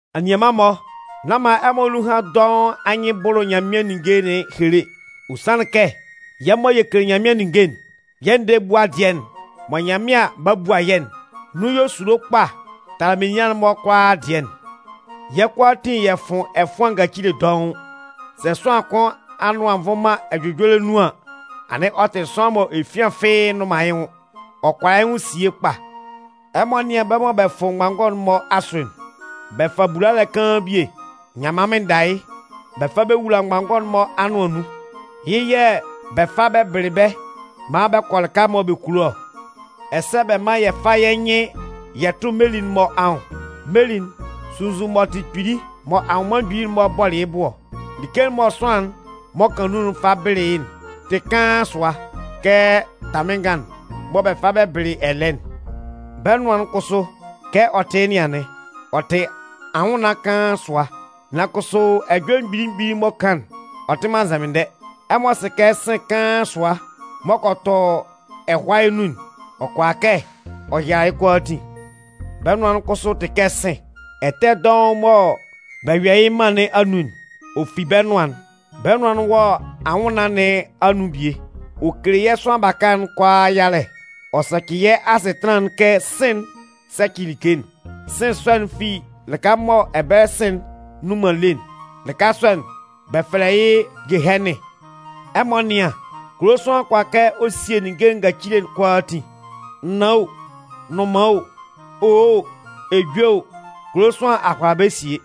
Anianman-mɔ, nán man ɛmɔ nunhan dɔʋn anyɩn bʋlʋ Nyanmɩan ninnge nɩn ehele. Ɔ sanlɩn kɛ yɛ́ mɔ yɛ kele Nyanmɩan ninnge'n, yɛ́ ndɛɛ ebua dɩɛ'n mɔ Nyanmɩan 'ba bua yɛ́'n, nun yɔ esulo kpa tala menian'n-mɔ kʋalaa dɩɛ'n. Yɛ́ kʋalaatin yɛ fʋn ɛfʋan ngacile dɔʋn. Sɛ sʋanlan kʋn anʋan nvʋn man ɛjʋjɔlɛ nun an, anɩn ɔ tɩ sʋanlan mɔ efian fɩ́ɩ́ nnʋn man yɩ́ nwʋn. Ɔ kʋala yɩ́ nwʋn sie kpa. Ɛmɔ nɩ́an bɛ́ mɔ bɛ fʋ mgbanngɔ'n-mɔ asʋ'n. Bɛ fa bulalɛ kaan bie, nyanman mɩnnda yɩ́, bɛ fa bɛ wula mgbanngɔ'n-mɔ anʋan nun. Yɩ́ yɛ̂ bɛ fa bɛ bɩlɩ bɛ́ maan bɛ kɔ lɩka mɔ bɛ kulo ɔ. Ɛsɛ bɛ mán yɛ fá yɛ́ nyɩn yɛ tʋ́ meli'n-mɔ anwʋn. Meli'n, sunnzun m'ɔ tɩ kpili mɔ anwʋnman mgbili'n-mɔ bɔlɩ yɩ́ bu ɔ, like'n mɔ sʋanlan'n m'ɔ kan nun'n fa bɩlɩ yɩ́'n tɩ kaan sʋa kɛ tamɩnngan'n mɔ bɛ fa bɛ bɩlɩ ɛlɛɛ'n. Bɛ́ nʋan'n kʋsʋ, kɛ ɔ tɩ yɩ́ nɩn anɩn. Ɔ tɩ anwʋnnaan kaan sʋa, nan kʋsʋ ɛjɔlɛ mgbili mgbili m'ɔ kan'n, ɔ tɩ man nzɛmɩndɛ. Ɛmɔ sɩ kɛ sɩ̂n kaan sʋa m'ɔ kɔ tɔ ɛhʋayɛ nun'n, ɔ kʋala kɛ ɔ yala yɩ́ kʋalaatin. Bɛ́ nʋan'n kʋsʋ tɩ kɛ sɩ̂n. Ɛtɛ dɔʋn mɔ bɛ yɔ yɩ́ mân nɩn anun'n, ɔ fi bɛ́ nʋan'n. Bɛ́ nʋan'n wɔ anwʋnnaan nɩn anun bie, ɔ kele yɛ́ sʋanlan baka'n kʋalaa yalɛ. Ɔ sɛcɩ yɛ́ asɩtanlan'n kɛ sɩ̂n'n sɛcɩ like'n. Sɩ̂n sɔ'n fi lɩka mɔ ɛbɛlɛ sɩ̂n'n nnun man lé'n. Lɩka sɔ'n, bɛ fɛlɛ yɩ́ Gehɛnɩn. Ɛmɔ nɩ́an, kulo sʋanlan kʋala kɛ ɔ sie ninnge ngacile'n kʋalaatin. Naan o, nnʋnman o, owo o, ejue o, kulo sʋanlan a hʋala bɛ́ sie.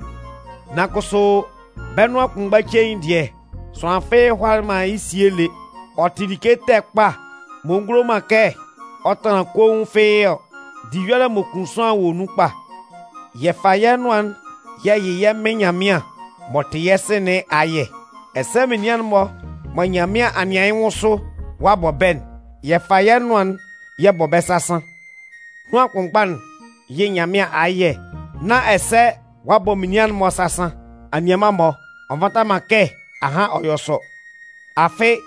Nan kʋsʋ, bɛ́ nʋan kʋnmgba cein dɩɛ, sʋanlan fɩ́ɩ́ hʋalalɩ man yɩ́ sie lé. Ɔ tɩ like ɛtɛ kpa m'ɔ ngulo man kɛ ɔ tanlan koun fɩ́ɩ́ ɔ. Diyɔlɛ m'ɔ kun sʋanlan wɔ nun kpa. Yɛ fa yɛ́ nʋan'n yɛ yɩ yɛ́ Mɩn Nyanmɩan m'ɔ tɩ yɛ́ Sɩ nɩn ayɛ, ɛsɛ menian'n-mɔ mɔ Nyanmɩan a nɩan yɩ́ nwʋn sʋ ɔ'a bɔ bɛ́'n, yɛ fa yɛ́ nʋan'n yɛ bɔ bɛ́ sasan. Nʋan kʋnmgba'n yɩ Nyanmɩan ayɛ nán ɛsɛ ɔ'a bɔ menian'n-mɔ sasan. Anianman-mɔ, ɔ nvata man kɛ ahan ɔ yɔ sɔ. Afɩ,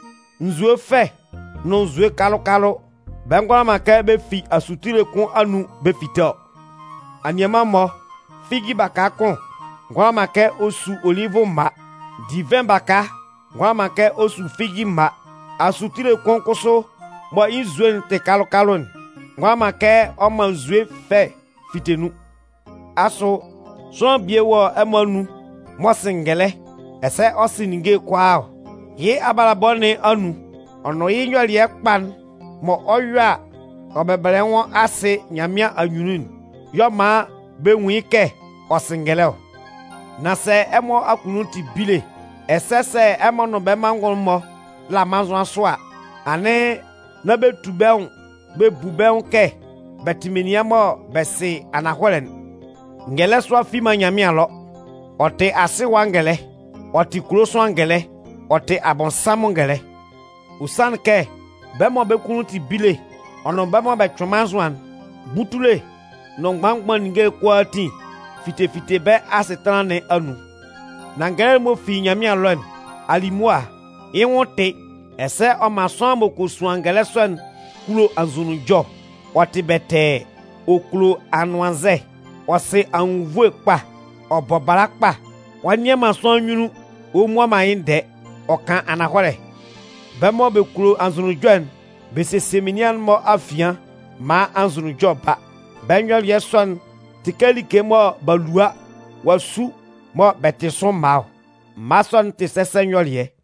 nzue fɛ nʋn nzue kalʋ-kalʋ, bɛ ngʋala man kɛ bɛ fi asutile kʋn anun bɛ fite ɔ. Anianman-mɔ, figi baka kʋn ngʋala man kɛ ɔ su olivʋ mma. Divɩn baka ngʋala man kɛ ɔ su figi mma. Asutile kʋn kʋsʋ mɔ yɩ́ nzue'n tɩ kalʋ-kalʋ'n ngʋala man kɛ ɔ man nzue fɛ fite nun. Asʋ sʋanlan bie wɔ ɛmɔ anun m'ɔ sɩ ngɛlɛ, ɛsɛ ɔ sɩ ninnge'n kʋalaa ɔ? Yɩ́ abalabɔ nɩn anun, ɔ nʋn yɩ́ nyɔlɩɛ kpa'n mɔ ɔ 'yɔ a, ɔ bɛbɛlɛ yɩ́ nwʋn asɩ Nyanmɩan anyunnun'n y'ɔ man bɛ nwun yɩ́ kɛ ɔ sɩ ngɛlɛ ɔ. Nan sɛ ɛmɔ akunnun tɩ bile, ɛsɛ sɛ ɛmɔ nʋn bɛ́ manngʋn'n-mɔ la mannzʋan sʋ a, anɩn nán bɛ tu bɛ́ nwʋn bɛ bu bɛ́ nwʋn kɛ bɛ tɩ menian mɔ bɛ sɩ ananhɔlɛ'n. Ngɛlɛ sʋa fi man Nyanmɩan ɛlɔ, ɔ tɩ asɩ ɛwa ngɛlɛ, ɔ tɩ kulo sʋanlan ngɛlɛ, ɔ tɩ Abɔnsanmʋn ngɛlɛ. Ɔ sanlɩn kɛ bɛ́ mɔ bɛ́ kunnun tɩ bile, ɔ nʋn bɛ́ mɔ bɛ cʋɩn mannzʋan'n, butule nʋn mgban mgban ninnge kʋalaatin fite fite bɛ́ asɩtanlan nɩn anun. Nan ngɛlɛ'n m'ɔ fi Nyanmɩan ɛlɔ'n, alimʋa, yɩ́ nwʋn tɩ, ɛsɛ ɔ man sʋanlan m'ɔ kɔ suan ngɛlɛ sɔ'n kulo anzʋnunjɔ, ɔ tɩ bɛtɛɛ, ɔ kulo anʋannzɛ, ɔ sɩ anwunnvoe kpa, ɔ bɔ bala kpa, ɔ nnɩan man sʋanlan nyunnun ɔ mmua man yɩ́ ndɛɛ, ɔ kan ananhɔlɛ. Bɛ́ mɔ bɛ kulo anzʋnunjɔ'n, bɛ sesie menian'n-mɔ afian maan anzʋnunjɔ ba. Bɛ́ nyɔlɩɛ sɔ'n tɩ kɛ like mɔ b'a lua ɔ'a su mɔ bɛ tɩ sʋ mma ɔ. Mma sɔ'n tɩ sɛsɛ nyɔlɩɛ.